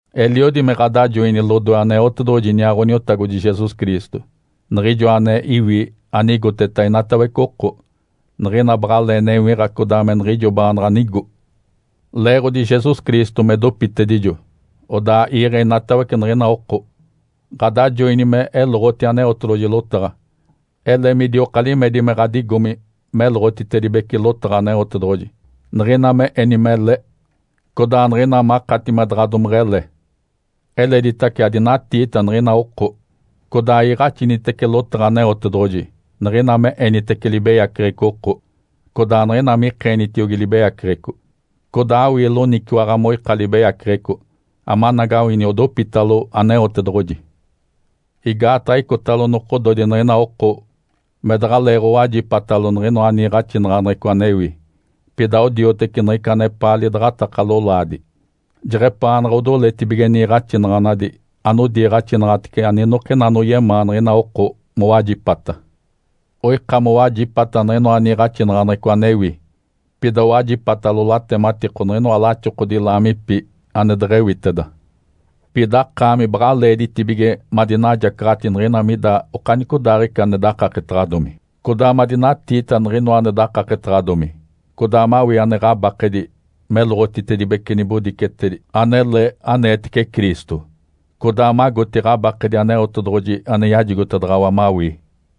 Eliodi me ɡ̶adajoini lodoe Aneotedoɡ̶oji iniaa Ǥoniotagodi Jesus Cristo, Niɡ̶ijoa ane iwi anigoteta inatawece oko, niɡ̶ina baɡ̶alee newiɡ̶a codaa me niɡ̶ijo baanaɡ̶a nigo. Leeɡ̶odi Jesus Cristo me dopitedijo odaa iiɡ̶e inatawece niɡ̶ina oko, ɡ̶adajoini me eloɡ̶oti Aneotedoɡ̶oji lotaɡ̶a. Ele midioka limedi me ɡ̶adigomi meloɡ̶otitedibece lotaɡ̶a Aneotedoɡ̶oji, niɡ̶ina me eni mele, codaa niɡ̶ina makati me daɡ̶a domeɡ̶ele. Eleditace, adinatiita niɡ̶ina oko, codaa iiɡ̶axinitece lotaɡ̶a Aneotedoɡ̶oji niɡ̶ina me enitece libeyaceɡ̶eco oko, codaa niɡ̶ina mikeenitiogi libeyaceɡ̶eco, codaa awii loniciwaɡ̶a moika libeyaceɡ̶eco, amanagawini odopitalo Aneotedoɡ̶oji. Igaataɡ̶a icotalo nokododi niɡ̶ina oko me daɡ̶aleeɡ̶owajipatalo niɡ̶inoa niiɡ̶axinaɡ̶aneɡ̶eco anewi. Pida odioteci niɡ̶ica anepaa lidaɡ̶ataka lolaadi. Jeɡ̶epaanaɡ̶a odoletibige niiɡ̶axinaɡ̶anadi anodiiɡ̶axinaɡ̶atece aninokina anoyemaa niɡ̶ina oko mowajipata. Oika mowajipata niɡ̶inoa niiɡ̶axinaɡ̶aneɡ̶eco anewi, pida owajipatalo latematiko niɡ̶inoa laxokodi laamipi ane deɡ̶ewiteda. Pida akaami baɡ̶a leeditibige madinajacaɡ̶ati niɡ̶ina mida okanicodaaɡ̶ica ane dakaketaɡ̶adomi, codaa madinatiita niɡ̶inoa ane dakaketaɡ̶adomi, codaa mawii ane ɡ̶abakedi meloɡ̶otitedibece nibodicetedi anele aneetece Cristo, codaa magoti ɡ̶abakedi Aneotedoɡ̶oji ane yajigotedaɡ̶awa mawii.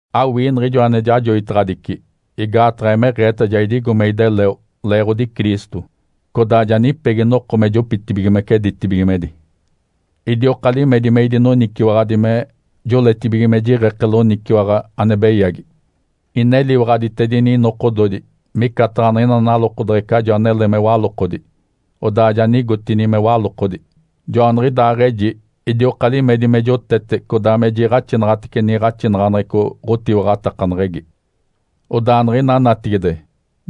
Awii niɡ̶ijo ane jajoitaɡ̶adici, igaataɡ̶a emeɡ̶eeta ja idigo me ideleo leeɡ̶odi Cristo, codaa ja nipegi noko me jopitibigimece ditibigimedi. Idioka limedi me idinoniciwaɡ̶adi me joletibige me jiɡ̶eke loniciwaɡ̶a ane beyagi. Ineliwaɡ̶aditedini inokododi micataɡ̶a niɡ̶ina nalokodeɡ̶ecajo anele me walokodi, odaa ja nigotini me walokodi. Joaniɡ̶idaaɡ̶eji idioka limedi me jotete codaa me jiiɡ̶axinaɡ̶atece niiɡ̶axinaɡ̶aneɡ̶eco ɡ̶otiwaɡ̶atakaneɡ̶egi. Odaa niɡ̶ina natigide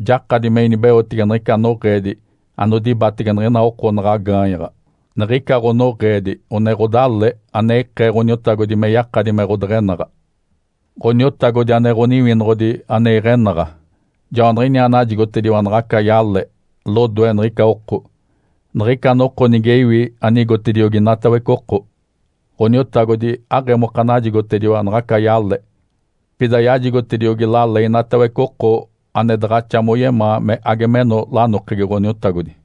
jakadi me inibeotege niɡ̶ica noɡ̶eedi anodibatege niɡ̶ina oko naɡ̶a gaanyaɡ̶a. Niɡ̶ica ɡ̶onoɡ̶eedi one ɡ̶odale ane ikee Ǥoniotagodi me yakadi me ɡ̶odeɡ̶enaɡ̶a. Ǥoniotagodi ane Ǥoniwinoɡ̶odi ane iɡ̶enaɡ̶a, Joaniɡ̶iniaa najigotediwa naɡ̶aca yale lodoe niɡ̶ica oko, niɡ̶ica noko nige iwi anigotediogi inatawece oko. Ǥoniotagodi aɡ̶emoka najigotediwa naɡ̶aca yale, pida yajigotediogi lale inatawece oko ane daɡ̶axa moyemaa me age meno lanokegi Ǥoniotagodi.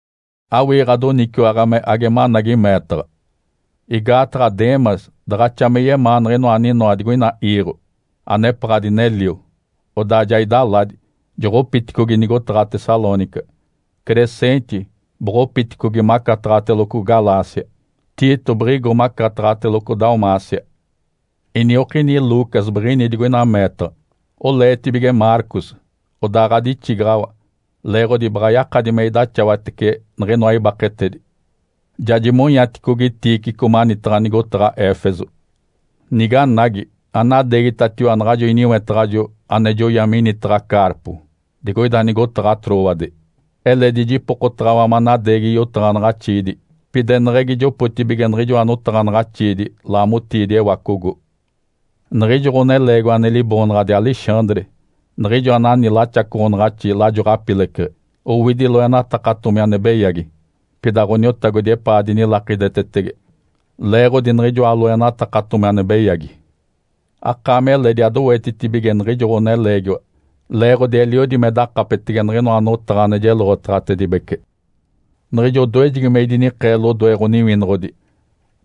Awii ɡ̶adoniciwaɡ̶a me age managi meetaɡ̶a. Igaataɡ̶a Demas daɡ̶axa me yemaa niɡ̶inoa aninoa digoina iiɡ̶o, anepaɡ̶a dinelio, odaa ja idaladi, joɡ̶opiticogi nigotaɡ̶a Tessalônica. Crescente boɡ̶opiticogi macataɡ̶ateloco Galácia, Tito biɡ̶igo macataɡ̶ateloco Dalmácia. Iniokini Lucas biɡ̶ini digoina meetaɡ̶a. Oleetibige Marcos, odaa ɡ̶adixigaɡ̶awa leeɡ̶odi baɡ̶a yakadi me idaxawatece niɡ̶inoa ibaketedi. Ja jimonyaticogi Tíquico manitaɡ̶a nigotaɡ̶a Éfeso. Niganagi, anadeegitatiwa naɡ̶ajo iniwetaɡ̶ajo ane joya minitaɡ̶a Carpo digoida nigotaɡ̶a Trôade. Eledi jipokotaɡ̶awa manadeegi yotaɡ̶anaɡ̶axiidi, pida eneɡ̶egi jopotibige niɡ̶ijoa notaɡ̶anaɡ̶axiidi laamotiidi ewacogo. Niɡ̶ijo ɡ̶oneleegiwa ane liboonaɡ̶adi Alexandre niɡ̶ijo anani laxacoɡ̶onaɡ̶axi lajo ɡ̶apileceɡ̶e, owidi loenatakatomi ane beyagi. Pida Ǥoniotagodi epaa dinilakidetetege leeɡ̶odi niɡ̶ijoa loenatakatomi ane beyagi. Akaami eledi adowetitibige niɡ̶ijo ɡ̶oneleegiwa, leeɡ̶odi eliodi me dakapetege niɡ̶inoa notaɡ̶a ane jeloɡ̶otaɡ̶atedibece. Niɡ̶ijo odoejegi me idinikee lodoe ɡ̶oniwinoɡ̶odi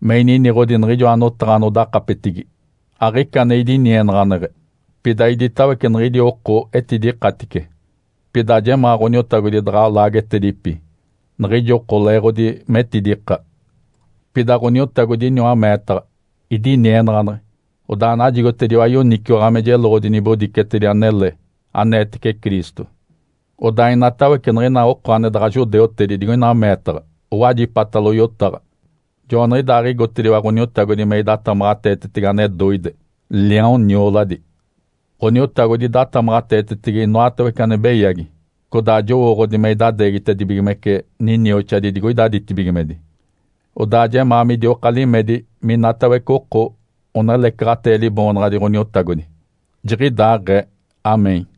me ininiɡ̶odi niɡ̶ijoa notaɡ̶a anodakapetigi, aɡ̶ica ane idinienaɡ̶aneɡ̶e, pida iditawece niɡ̶idi oko etidikatice. Pida ajemaa Ǥoniotagodi daɡ̶a laagetedipi niɡ̶ijo oko leeɡ̶odi metidika. Pida Ǥoniotagodi iniwa meetaɡ̶a, idinienaɡ̶aneɡ̶e, odaa najigotediwa yoniciwaɡ̶a me jeloɡ̶odi nibodicetedi anele aneetece Cristo. Odaa inatawece niɡ̶ina oko ane daɡ̶a judeutedi digoina meetaɡ̶a owajipatalo yotaɡ̶a. Joaniɡ̶idaaɡ̶igotediwa Ǥoniotagodi me idatamaɡ̶ateetetege ane doide, liaon nioladi. Ǥoniotagodi idatamaɡ̶ateetetege inoatawece ane beyagi, codaa jowooɡ̶odi me idadeegitedibigimece ninioxadi digoida ditibigimedi. Odaa jemaa midioka limedi minatawece oko onelecaɡ̶atee Liboonaɡ̶adi Ǥoniotagodi. Jiɡ̶idaaɡ̶ee (Amém).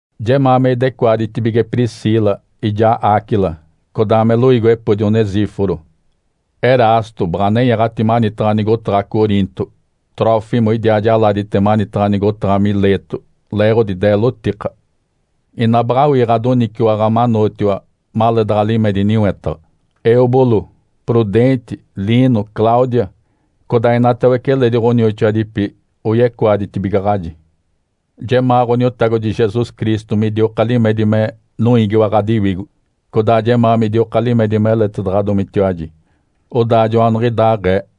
Jemaa me idecoaditibige Priscila ijaa Áquila, codaa me loiigiwepodi Onesíforo. Erasto baɡ̶a nenyaɡ̶ati manitaɡ̶a nigotaɡ̶a Coriinto, Trófimo idiaa jaladite manitaɡ̶a nigotaɡ̶a Mileto leeɡ̶odi deelotika. Ina baɡ̶awii ɡ̶adoniciwaɡ̶a manootiwa maleedaɡ̶a limedi niwetaɡ̶a. Êubulo, Prudente, Lino, Cláudia, codaa inatawece eledi ɡ̶onioxoadipi oyecoaditibigaɡ̶aji. Jemaa Ǥoniotagodi Jesus Cristo midioka limedi me noiigiwa ɡ̶adiwigo. Codaa jemaa midioka limedi meletedaɡ̶adomitiwaji. Odaa joaniɡ̶idaaɡ̶ee.